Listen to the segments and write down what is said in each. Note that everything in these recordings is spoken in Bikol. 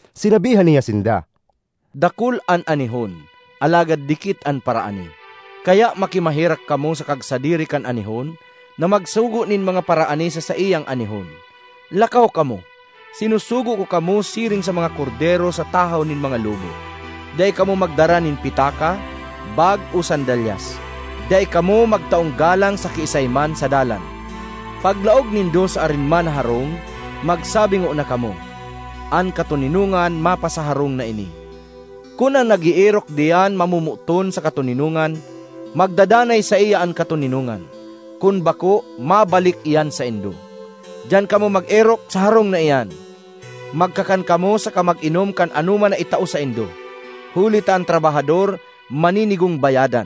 Sinabihan niya sinda, “Dakul an anihon, alagad dikit an paraani; kaya makimaherak kamo sa kagsadiri kan anihon na magsugo nin mga paraani sa saiyang anihon. Lakaw kamo! Sinusugo ko kamo siring sa mga kordero sa tahaw nin mga lobo. Dai kamo magdara nin pitaka, bag o sandalyas; dai kamo magtaong galang sa kiisay man sa dalan. Paglaog nindo sa arin man na harong, magsabi ngona kamo, ‘An Katoninongan mapasa harong na ini.’ Kun an nag-eerok diyan mamomoton sa katoninongan, magdadanay saiya an katoninongan; kun bako, mabalik iyan saindo. Diyan kamo mag-erok sa harong na iyan; magkakan kamo saka mag-inom kan anoman na itao saindo, huli ta an trabahador maninigong bayadan.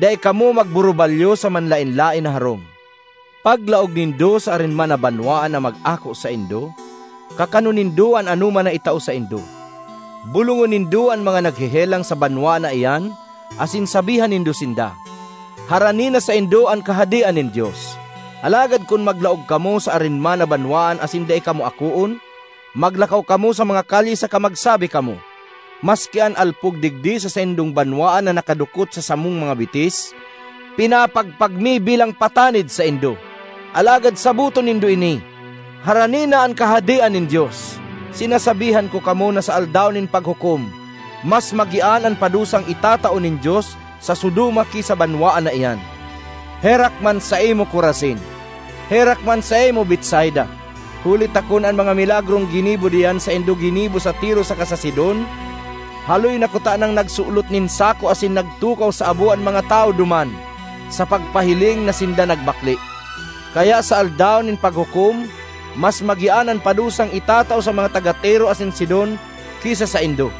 Dai kamo magburubalyo sa manlaen-laen na harong. Paglaog nindo sa arin man na banwaan na mag-ako saindo, kakanon nindo an anoman na itao saindo. Bolongon nindo an mga naghehelang sa banwaan na iyan asin sabihan nindo sinda, ‘Harani na saindo an Kahadean nin Dios.’ Alagad kun maglaog kamo sa arin man na banwaan asin dai kamo akoon, maglakaw kamo sa mga kalye saka magsabi kamo, ‘Maski an alpog digdi sa saindong banwaan na nakadukot sa samong mga bitis, pinapagpag mi bilang patanid saindo. Alagad saboton nindo ini: harani na an Kahadean nin Dios!’ Sinasabihan ko kamo na sa Aldaw nin Paghukom mas magian an padusang itatao nin Dios sa Sodoma ki sa banwaan na iyan! ”Herak man saimo, Corazin! Herak man saimo, Betsaida! Huli ta kun an mga milagrong ginibo diyan saindo ginibo sa Tiro saka sa Sidon, haloy na kutanang nagsulot nin sako asin nagtukaw sa abo an mga tawo duman sa pagpahiling na sinda nagbakle! Kaya sa Aldaw nin Paghukom mas magian an padusang itatao sa mga taga Tiro asin Sidon ki sa saindo.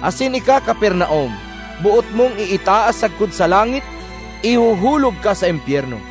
Asin ika, Capernaum, boot mong iitaas sagkod sa langit? Ihuhulog ka sa impyerno!”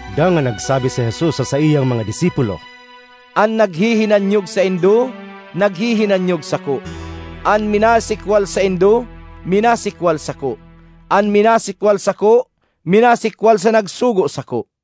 Dangan nagsabi si Jesus sa saiyang mga disipulo, “An naghihinanyog saindo, naghihinanyog sako; an minasikwal saindo, minasikwal sako; an minasikwal sako, minasikwal sa nagsugo sako.”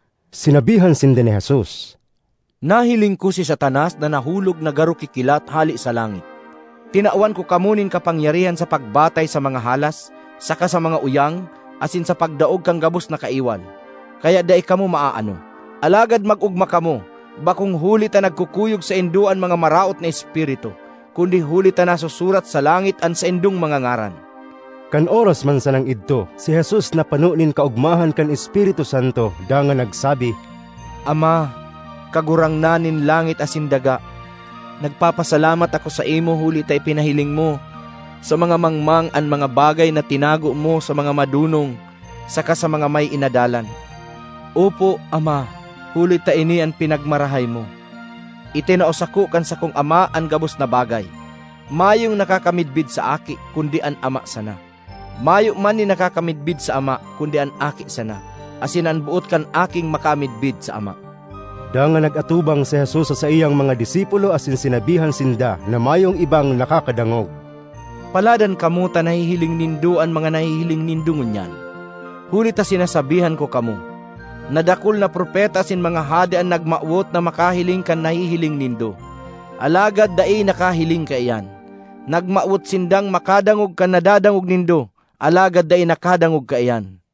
Sinabihan sinda ni Jesus, “Nahiling ko si Satanas na nahulog na garo kikilat hale sa langit. Tinawan ko kamo nin kapangyarihan sa pagbatay sa mga halas saka sa mga uyang asin sa pagdaog kan gabos na kaiwal, kaya dai kamo maaano. Alagad mag-ogma kamo bakong huli ta nagkukuyog saindo an mga maraot na espiritu kundi huli ta nasusurat sa langit an saindong mga ngaran.” Kan oras man sanang idto si Jesus napano nin kaogmahan kan Espiritu Santo dangan nagsabi, “Ama, Kagurangnan nin langit asin daga, nagpapasalamat ako saimo huli ta ipinahiling mo sa mga mangmang an mga bagay na tinago mo sa mga madonong saka sa mga may inadalan. Opo, Ama, huli ta ini an pinagmarahay mo. ”Itinao sako kan sakong Ama an gabos na bagay. Mayong nakakamidbid sa Aki kundi an Ama sana; mayo man nin nakakamidbid sa Ama kundi an Aki sana asin an boot kan Aking makamidbid sa Ama.” Dangan nag-atubang si Jesus sa saiyang mga disipulo asin sinabihan sinda na mayong ibang nakakadangog, “Paladan kamo ta nahihiling nindo an mga nahihiling nindo ngunyan! Huli ta sinasabihan ko kamo, na dakul na propeta asin mga hade an nagmawot na makahiling kan nahihiling nindo, alagad dai nakahiling kaiyan; nagmawot sindang makadangog kan nadadangog nindo alagad dai nakadangog kaiyan.”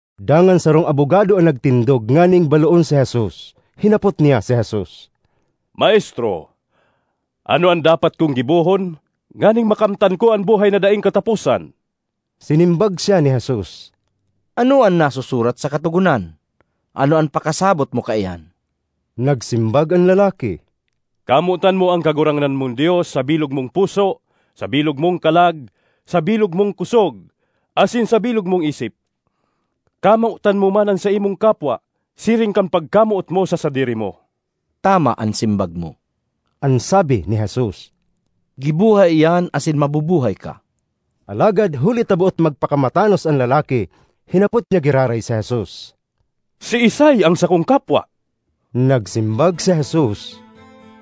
Dangan sarong abogado an nagtindog nganing baloon si Jesus. Hinapot niya si Jesus, “Maestro, ano an dapat kong gibohon nganing makamtan ko an buhay na daing kataposan?” Sinimbag siya ni Jesus, “Ano an nasusurat sa Katogonan? Ano an pakasabot mo kaiyan?” Nagsimbag an lalaki, “Kamotan mo an Kagurangnan mong Dios sa bilog mong puso, sa bilog mong kalag, sa bilog mong kosog, asin sa bilog mong isip; kamotan mo man an saimong kapwa siring kan pagkamoot mo sa sadiri mo.” ”Tama an simbag mo,” an sabi ni Jesus. “Giboha iyan asin mabubuhay ka.” Alagad, huli ta boot magpakamatanos an lalaki, hinapot niya giraray si Jesus, “Siisay an sakong kapwa?” Nagsimbag si Jesus,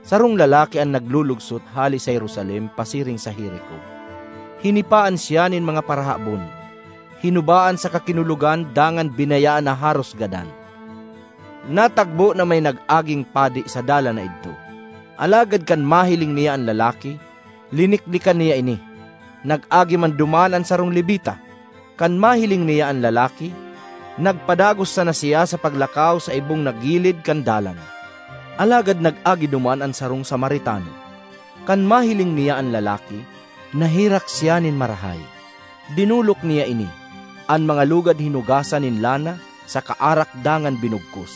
“Sarong lalaki an naglulugsot hale sa Jerusalem pasiring sa Jerico. Hinipaan siya nin mga parahabon, hinubaan saka kinulogan dangan binayaan na haros gadan. Natagbo na may nag-aging padi sa dalan na idto. Alagad kan mahiling niya an lalaki, liniklikan niya ini. Nag-agi man duman an sarong Levita. Kan mahiling niya an lalaki, nagpadagos sana siya sa paglakaw sa ibong na gilid kan dalan. Alagad nag-agi duman an sarong Samaritano. Kan mahiling niya an lalaki, naherak siya nin marahay. Dinolok niya ini, an mga lugad hinugasan nin lana saka arak dangan binugkos.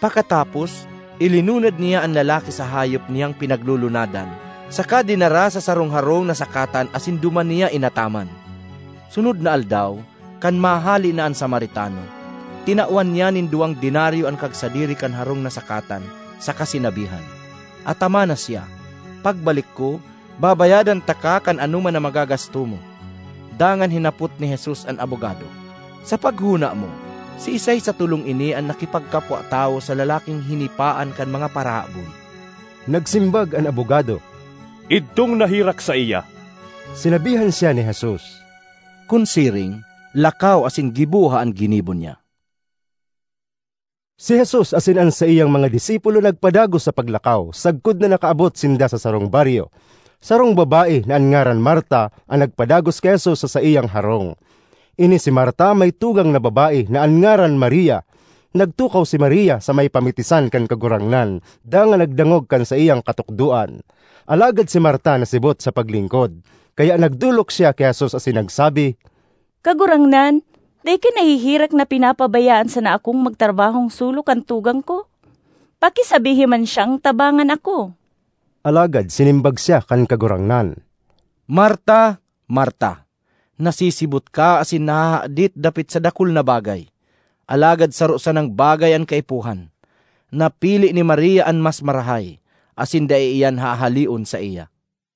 Pakatapos, ilinunad niya an lalaki sa hayop niyang pinaglulunadan saka dinara sa sarong harong na sakatan asin duman niya inataman. Sunod na aldaw, kan mahale na an Samaritano, tinawan niya nin duwang denaryo an kagsadiri kan harong na sakatan saka sinabihan, ‘Atamana siya; pagbalik ko, babayadan taka kan anoman na magagasto mo.’” Dangan hinapot ni Jesus an abogado, “Sa paghona mo, siisay sa tolong ini an nakipagkapwa-tawo sa lalaking hinipaan kan mga parahabon?” Nagsimbag an abogado, “Idtong naherak saiya.” Sinabihan siya ni Jesus, “Kun siring, lakaw asin giboha an ginibo niya.” Si Jesus asin an saiyang mga disipulo nagpadagos sa paglakaw sagkod na nakaabot sinda sa sarong baryo. Sarong babae, na an ngaran Marta, an nagpadagos ki Jesus sa saiyang harong. Ini si Marta may tugang na babae na an ngaran Maria. Nagtukaw si Maria sa may pamitisan kan Kagurangnan dangan nagdangog kan saiyang katukdoan. Alagad si Marta nasibot sa paglingkod; kaya nagdolok siya ki Jesus asin nagsabi, “Kagurangnan, dai ka naheherak na pinapabayaan sana akong magtrabahong solo kan tugang ko? Pakisabihi man siyang tabangan ako.” Alagad sinimbag siya kan Kagurangnan, “Marta, Marta, nasisibot ka asin nahahadit dapit sa dakul na bagay, alagad saro sanang bagay an kaipuhan. Napili ni Maria an mas marahay, asin dai iyan hahaleon saiya.”